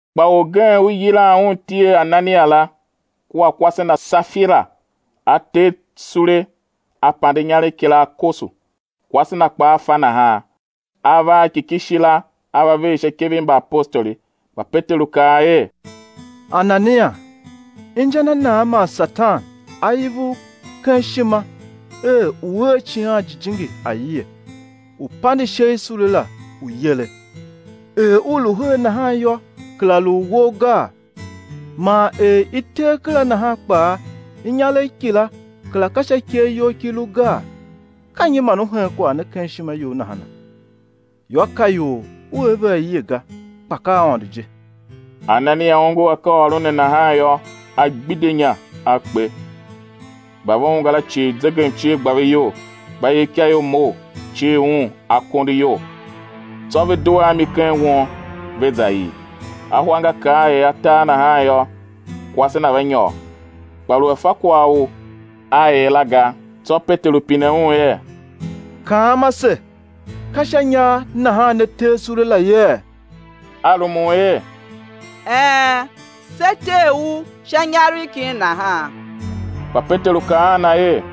Kpa orgen u i yilan un iti er Anania la, kua kwase na Safira, a tee sule a pande inyaregh kila, a koso, kwase na kpaa fa nahan, a va a ki ki shi la a va ver sha ikev i mbaapostoli. Kpa Peteru kaa er: Anania, inja na nan man Satan a iv u ken ishima er u̱ er Icighan Jijingi aie, u̱ pande ishe i sule la u̱ yere? Er u lu her nahan yô, kera lu u wou gaa? Man er i tee kera nahan kpaa, inyaregh kila kera ka sha ikev you ki lu gaa? Ka nyi man u hen kwagh ne ken ishima you nahana? Yô, ka ior u er ve aie ga, kpa ka Aôndo je. Anania ongo akaaôron ne nahan yô, a gbidye inya, a kpe; mba ve ungwa la cii zegemcie gba ve iyol. Mbayevikaior mough, cir un akondo iyol, tsô ve due a mi ken won, ve za ii. Ahwa nga kar er atar nahan yô, kwase na va nyôr, kpa lu a fa kwagh u a er la ga. Tsô Peteru pine un er: Kaam ase, ka sha inyar nahan ne tee sule la yee? A rumun er: Een, se tee u sha inyaregh kin nahan. Kpa Peteru kaa a na er: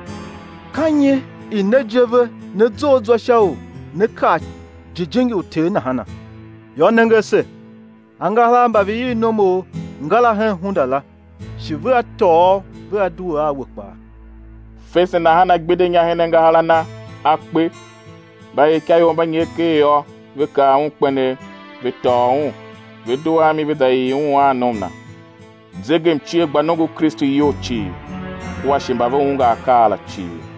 Ka nyi i ne je ve ne zough zwa sha u né kar Jijingi u Ter nahana? Yô, nenge ase, angahar a mba ve ii nomu, ngara hen hunda la, shi vea tôô u vea due a we kpaa. Fese nahan a gbidye inya her angahar a na, a kpe. Mbayevikaior mba nyer ker yô, ve kav un kpenegh; ve tôô un, ve due a mi ve za ii un a nom na. Zegemcie gba nongo u Kristu iyol cii, kua shi mba ve ungwa akaa la cii.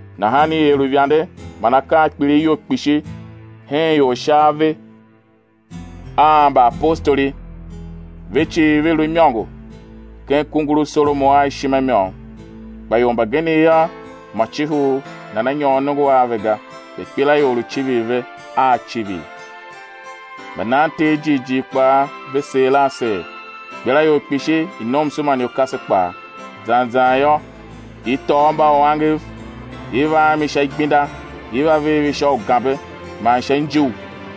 Nahan i er uivande man akaa a kpilighyol kpishi hen ior sha ave a mbaapostoli; ve cii ve lu imôngo ken kungur u Solomon a ishima i môm. Kpa ior mbagenev yô, mô cihi u nana nyôr nongo a ve ga, kpa ikpelaior lu civir ve a civir. Mbanan Ter jighjigh kpaa ve seer a seer, ikpelaior kpishi i nomso man i ukase kpaa; zan zan yô, i tôô mbauangev, i va a mi sha igbenda, i va ver ve sha ugambe man sha injugh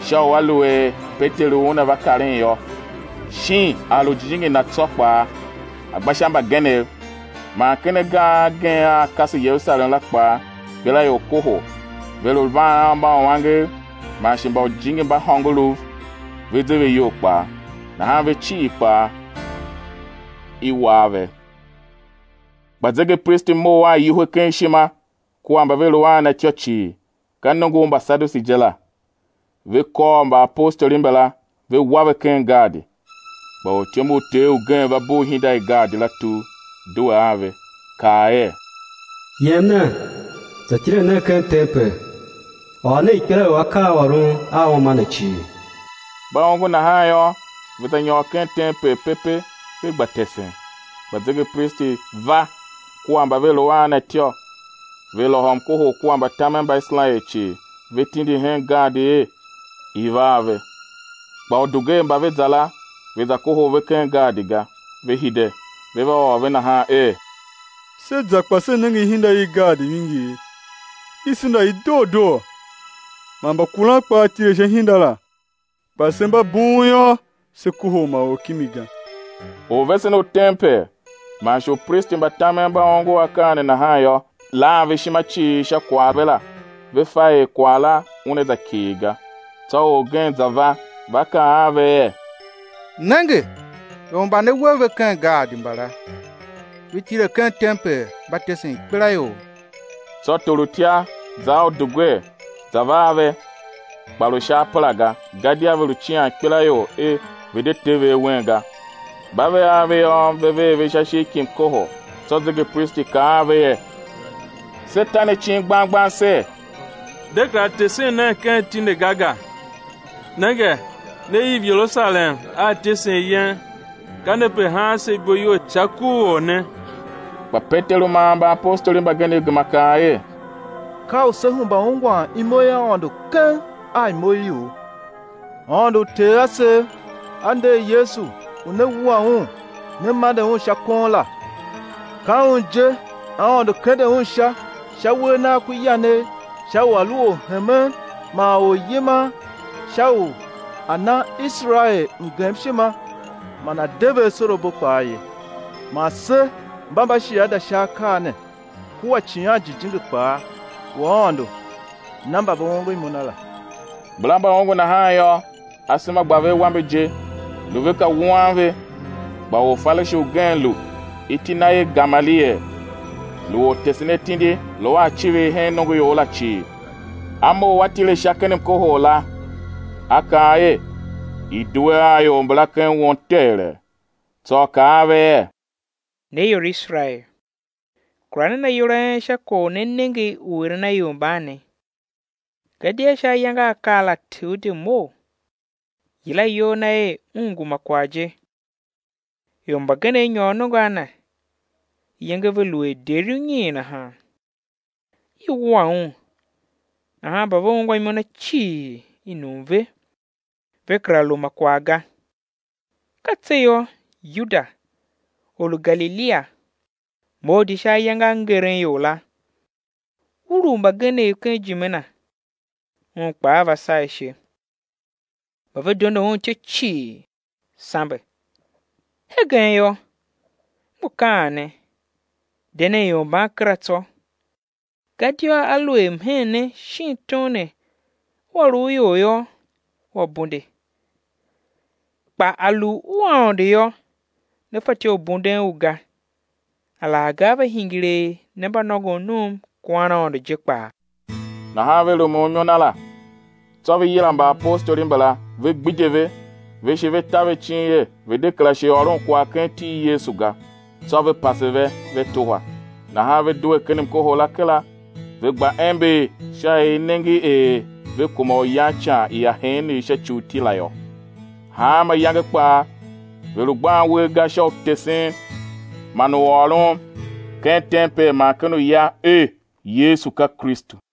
sha u aluer Peteru una va karen yô, shin a lu jijingi na tsô kpaa a gba sha mbagenev. Man ken agar agen a a kase Yerusalem la kpaa ikpelaior kohol, ve lu van a mbauangev man shi mba ujijingi mba hôngorouv ve ze ve iyol kpaa; nahan ve cii kpaa i war ve. Kpa zegepristi mough a iwuhe ken ishima kua mba ve lu a na ityô cii, ka nongo u Mbasadushi je la, ve kôr mbaapostoli mbala, ve wa ve ken gaadi. Kpa ortyom u Ter ugen va bugh ihinda i gaadi la tugh, due a ve, kaa er: Yem nen, za tile nen ken tempel, ôr nen ikpelaior akaaôron a uma ne cii. Mba ongo nahan yô, ve za nyôr ken tempel pepe, ve gba tesen. Kpa zegepristi va kua mba ve lu a na ityô, ve lôhô mkohol kua mbatamen mba Iserael cii, ve tindi hen gaadi er i̱ va a ve. Kpa udugwer mba ve za la, ve za kohol ve ken gaadi ga; ve hide, ve va ôr ve nahan er: Se za kpa se nenge ihinda i gaadi vingir, i senda i doo doo, man mbakuran kpaa tile sha ihinda la; kpa se mba bughun yô, se kohol ma or kimi ga. Orvesen u tempel man shi upristi mba tamen mba ongo akaa ne nahan yô, lan ve ishima cii sha kwagh ve la ve fa er kwagh la una za kighir ga. Tsô orgen za va, va kaa a ve er: Nenge, ior mba ne we ve ken gaadi mbala, ve tile ken tempel, mba tesen ikpelaior. Tsô torutya za a udugwer, za va a ve, kpa lu sha apera ga, gadia ve lu cian ikpelaior er ve̱ de te ve awen ga. Mba ve a ve yô, ve ver ve sha ishigh ki mkohol. Tsô zegepristi kaa a ve er: Se ta ne icin gbang gbang ser: De kera tesen nen ken iti ne ga ga? Nenge, ne iv Yerusalem a ityesen yen, ka ne pe haan se ibo iyol sha ku u Or ne. Kpa Peteru man mbaapostoli mbagenev gema kaa er: Ka u sé hemba ungwan imo i Aôndo keng a imo i ior. Aôndo u uter asev A nder Yesu u ne wua Un ne mande Un sha kon la. Ka Un je Aôndo kende Un sha sha uwegh Nagh ku yanegh sha u A̱ lu Orhemen man Oryiman, sha u A̱ na Iserael mgemshima man A̱ de ve asorabo kpaa ye. Man se mba mbashiada sha akaa ne, kua Icighan Jijingi kpaa u Aôndo na mba ve ongo imo Na la. Mbala mba ongo nahan yô, asema gba ve awambe je, lu ve ka wuan ve. Kpa Orfarishi ugen lu, iti na er Gamaliel, lu ortesenatindi lu a icivir hen nongoior la cii, a mough a tile sha ken mkohol la, a kaa er, i̱ due a ior mbala ken won teghelee; tsô a kaa a ve er: Ne ior i Iserael, kura nen ayol a en sha kwagh u ne nenge u eren a ior mban ne. Gadia sha ayange a a kar la Teuda mough, yila iyol na er un ngu ma kwagh je; ior mbagenev nyôr nongo a na, iyenge ve lu er deri unyiin nahan. I wua un, nahan mba ve ungwa imo na cii, i num ve, ve kera lu ma kwagh ga. Ka tse yô, Yuda, or u Galilia, mough di sha ayange a ngeren ior la, ulugh mbagenev ken ijime na; un kpaa va saa ishe; mba ve dondo un ityô cii, sambe. Hegen yô, m ngu kaan ne: De nen ior mban kera tsô; gadia aluer mhen ne shin tom ne ua lu u ior yô, ua bunde; kpa a lu u Aôndo yô, né fatyô u bunden u ga, alaghga á va hingir er ne mba nôngon num kuan Aôndo je kpaa. Nahan ve rumun imo na la. Tsô ve yila mbaapostoli mbala, ve gbidye ve, ve shi ve ta ve icin er ve̱ de kera shi ôron kwagh ken iti i Yesu ga; tsô ve pase ve, ve tuhwa. Nahan ve due ken mkohol la kera, ve gba ember sha er i nenge er ve kuma u yan ican i aheenegh sha ci u iti la yô. Hanma iyange kpaa ve lu gban uwer ga sha u tesen man u ôron ken tempel man ken uya er Yesu ka Kristu.